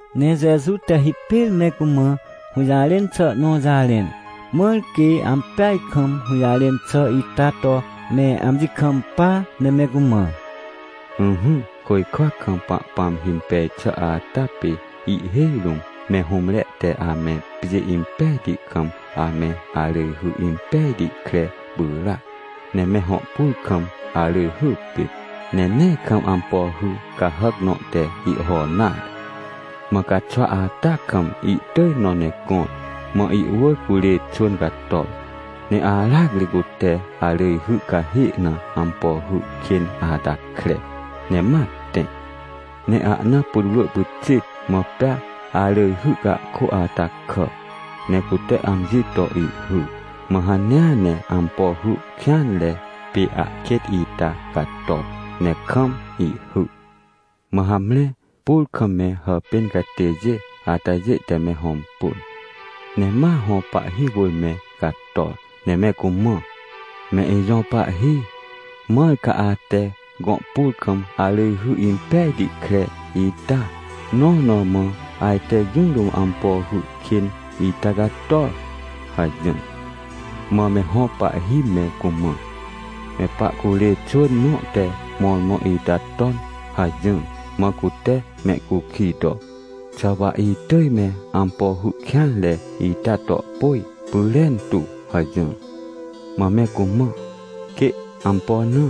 Ne Jeju te hipêr me cumã hũjarẽn xà nõ jarẽn, mãr quê ampeaj kam hũjarẽn xà ita to me amji kampa, ne me cumã: — Ỹhỹ, côjkwa kam Pahpãm himpej xà ata pê ihhêj rũm me hũmre te ame pjê impejti kam ame arỳjhy impejti kre pyràac. Ne me hõ pur kam arỳjhy pit, ne nee kam ampo hy cahàc nõ te ihho nare. Mã caxwa ata kam ihtỳj nõ ne gõr. Mã ihwỳr curê xwỳn cator, ne aracri cute arỳjhy cahê na ampo hy kên ata kre, ne ma tẽ. Ne ahna putwrỳ pyxit, mã pea arỳjhy cahkô ata kà, ne cute amji to ihhy, mã hanea ne ampo hy kêanre pê ahkêt ita cator ne kam ihhy. — Mã hamre pur kam me hàpên catêjê atajê te me hõmpun, ne ma hõ pahhi wỳr me cator, ne me cumã: “Me ijõ pahhi, mãr ca ate gõ pur kam arỳjhy impejti kre ita? Nõ na mã ajte jũ rũm ampo hy kên ita cator?” hajỹr. — Mã me hõ pahhi me cumã: “Me pahcurê xwỳn nõ te mõrmõ ita ton” hajỹr. Mã cute mehcukij to: “Xà wa itỳj me ampo hy kêanre ita to pôj pyrentu?” hajỹr. — Mã me cumã: “Quê. Ampo na?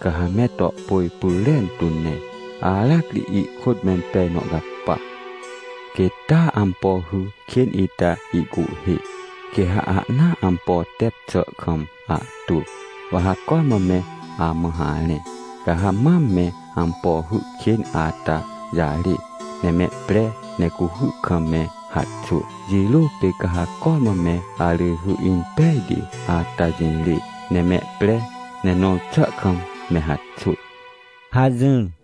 Ca ha me to pôj pyrentu ne aracri ihkôt mempej nõ capa. Quêt taa ampo hy kên ita ihcuhhê, quê ha ahnaa ampo tep xà kam ahtwỳ, wa ha cormã me amã harẽ, ca ha mam me ampo hy kên ata jarê ne mehpre ne cuhy kam me haxwỳ. Jirô pê ca ha cormã me arỳjhy impejti ata jirê ne mehpre, ne nõr xà kam me haxwỳ” — hajỹr.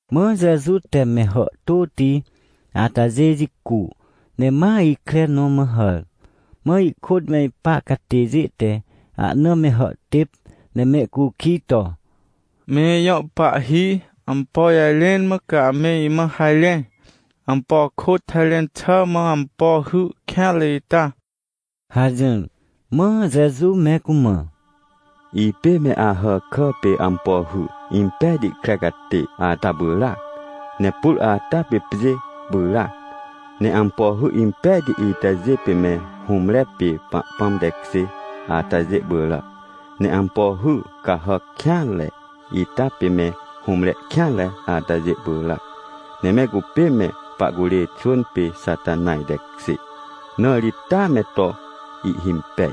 Mã Jeju te me hàhtôti atajê jicu, ne ma ikre nõ ma hàr. Mã ihkôt me ipa catêjê te ahna me hàhtêp, ne mehcukij to: — Me ijõ pahhi, ampo jarẽn mã ca ame imã harẽ? Ampo kôt harẽn xà mã ampo hy kêanre ita? — hajỹr. Mã Jeju me cumã: — Ipê me Ahàkà pê ampo hy impejti kre catê ata pyràac. Ne pur ata pê pjê pyràac. Ne ampo hy impejti itajê pê me hũmre pê Pahpãm tekjê atajê pyràac. Ne ampo hy cahàc kêanre ita pê me hũmre kêanre atajê pyràac. Ne me cupê me pahcurê xwỳn pê Xatanaj tekjê, na ri taa me to ihhimpej.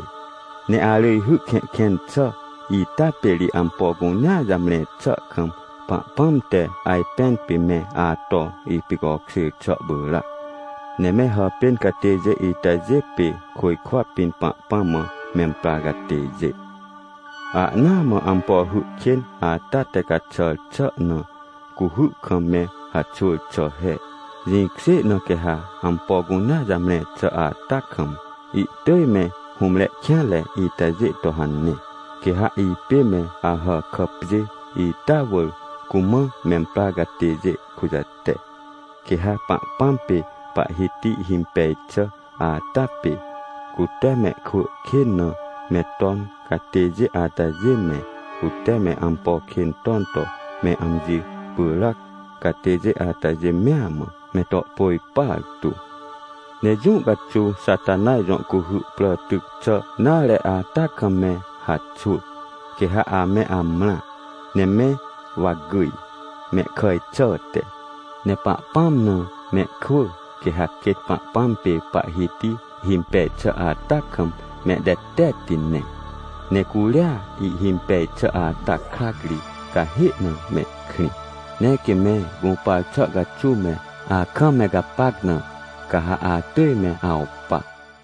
Ne arỳjhy kẽhkẽn xà ita pê ri ampo cunea jamre xà kam Pahpãm te ajpẽn pê me ato ipicokjêr xà pyràac. Ne me hàpên catêjê itajê pê côjkwa pĩn Pahpãm mã memprar catêjê. — Ahnaa mã ampo hy kên ata te caxàr xà na cuhy kam me haxwỳr xà he, jĩkjê na quê ha ampo cunea jamre xà ata kam, ihtỳj me hũmre kêanre itajê to hane. Quê ha ipê me Ahàkà pjê ita wỳr cumã memprar catêjê kujate, quê ha Pahpãm pê Pahhiti himpej xà ata pê, cute mehkwỳ kên na me ton catêjê atajê me, cute me ampo kên ton to me amji pyràc catêjê atajê mea mã, me to pôj partu. Ne jũ caxuw Xatanaj jõ cuhy prà tyc xà nare ata kam me haxwỳ, quê ha ame amrã, ne me wa gyj, mehkàj xàhte. Ne Pahpãm na mehkwỳ, quê ha quêt Pahpãm pê Pahhiti himpej xà ata kam mehtetetti ne, ne curia ihhimpej xà ata krac ri, cahê na mehkrĩ. Ne quê me gũpar xà caxuw me akam me gapac na, ca ha atỳj me awpa.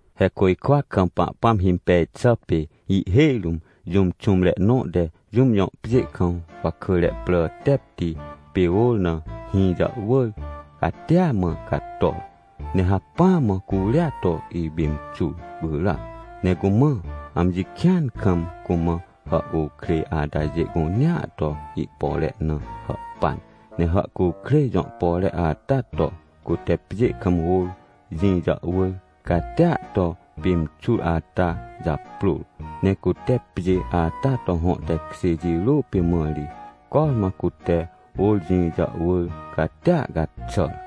— He côjkwa kam Pahpãm himpej xà pê ihhêj rũm jũm xũmre nõ te jũm jõ pjê kam wakỳre prà tepti pê ôr na hĩ jàhwỳr catia mã cator, ne hacpỹa mã curia to ipimxur pyràac. Ne cumã amji kĩan kam cumã hàhcukrêj atajê cunea to ihpore na hàhpan, ne hàhcukrêj jõ pore ata to, cute pjê kam ôr jĩ jàhwỳr catia to pimxur ata japrôr. Ne cute pjê ata to hõ tekjê jirô pê mã ri cormã cute ôr jĩ jàhwỳr catia caxàr.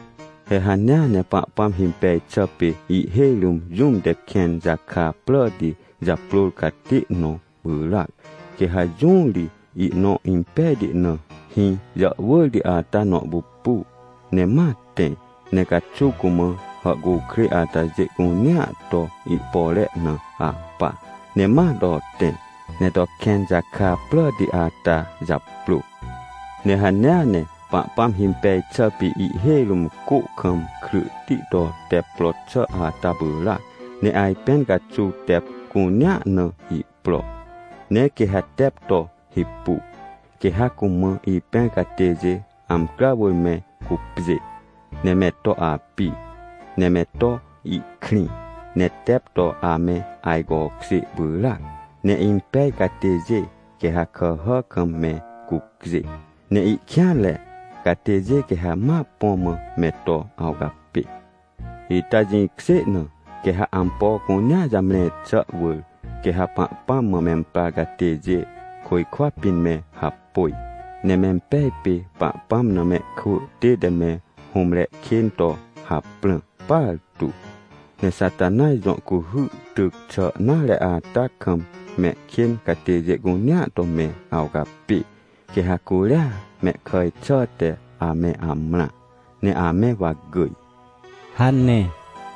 — He hanea ne Pahpãm himpej xà pê ihhêj rũm jũm te kẽn jaka pràti japrôr catê nõ pyràac. Quê ha jũ ri ihnõ impejti na, hĩ jàhwỳrti ata nõ pupu, ne ma tẽ ne caxuw cumã hàhcukrêj atajê cunea to ihpore na ahpa, ne ma to tẽ, ne to kẽn jaka pràti ata japrô. — Ne hanea ne Pahpãm himpej xà pê ihhêj rũm cô kam kryhti to tep pro xà ata pyràac, ne ajpẽn caxuw tep cunea na ihpro. Ne quê ha tep to hipu, quê ha cumã ipẽr catêjê amcrà wỳr me cupjê, ne me to api, ne me to ihkrĩ, ne tep to ame ajcokjê pyràac. Ne impej catêjê quê ha kàhà kam me cucjê, ne ihkêanre catêjê quê ha ma põ mã me to awcapê. — Ita jĩkjê na quê ha ampo cunea jamre xà wỳr, quê ha Pahpãm mã memprar catêjê, côjkwa pĩn me hapôj, ne mempej pê Pahpãm na mehkwỳ tête me hũmre kên to haprãr partu. Ne Xatanaj jõ cuhy tyc xà nare ata kam mehkên catêjê cunea to me awcapê, quê ha curia mehkàj xàhte ame amrã, ne ame wa gyj — hane.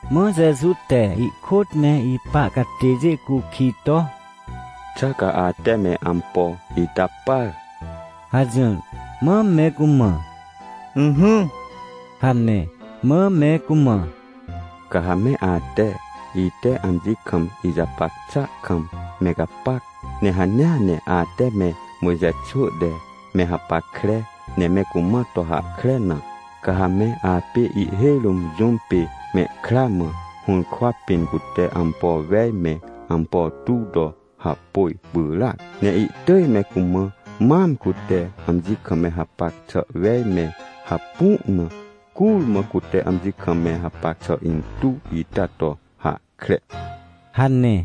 Mã Jeju te ihkôt me ipa catêjê cukij to: — Xà ca ate me ampo ita par? — hajỹr. Mã me cumã: — Ỹhỹ — hane. Mã me cumã: — Ca ha me ate, ite amji kam ijapac xà kam me gapac, ne hanea ne ate me Mojxe xwỳ te me hapackre ne me cumã to hahkre na, ca ha me apê ihhêj rũm jũm pê mehkra mã hũrkwa pĩn cute ampo wej me ampo tuw to hapôj pyràac. Ne ihtỳj me cumã mam cute amji kam me hapac xà wej me hapu na, curmã cute amji kam me hapac xà intuw ita to hahkre — hane.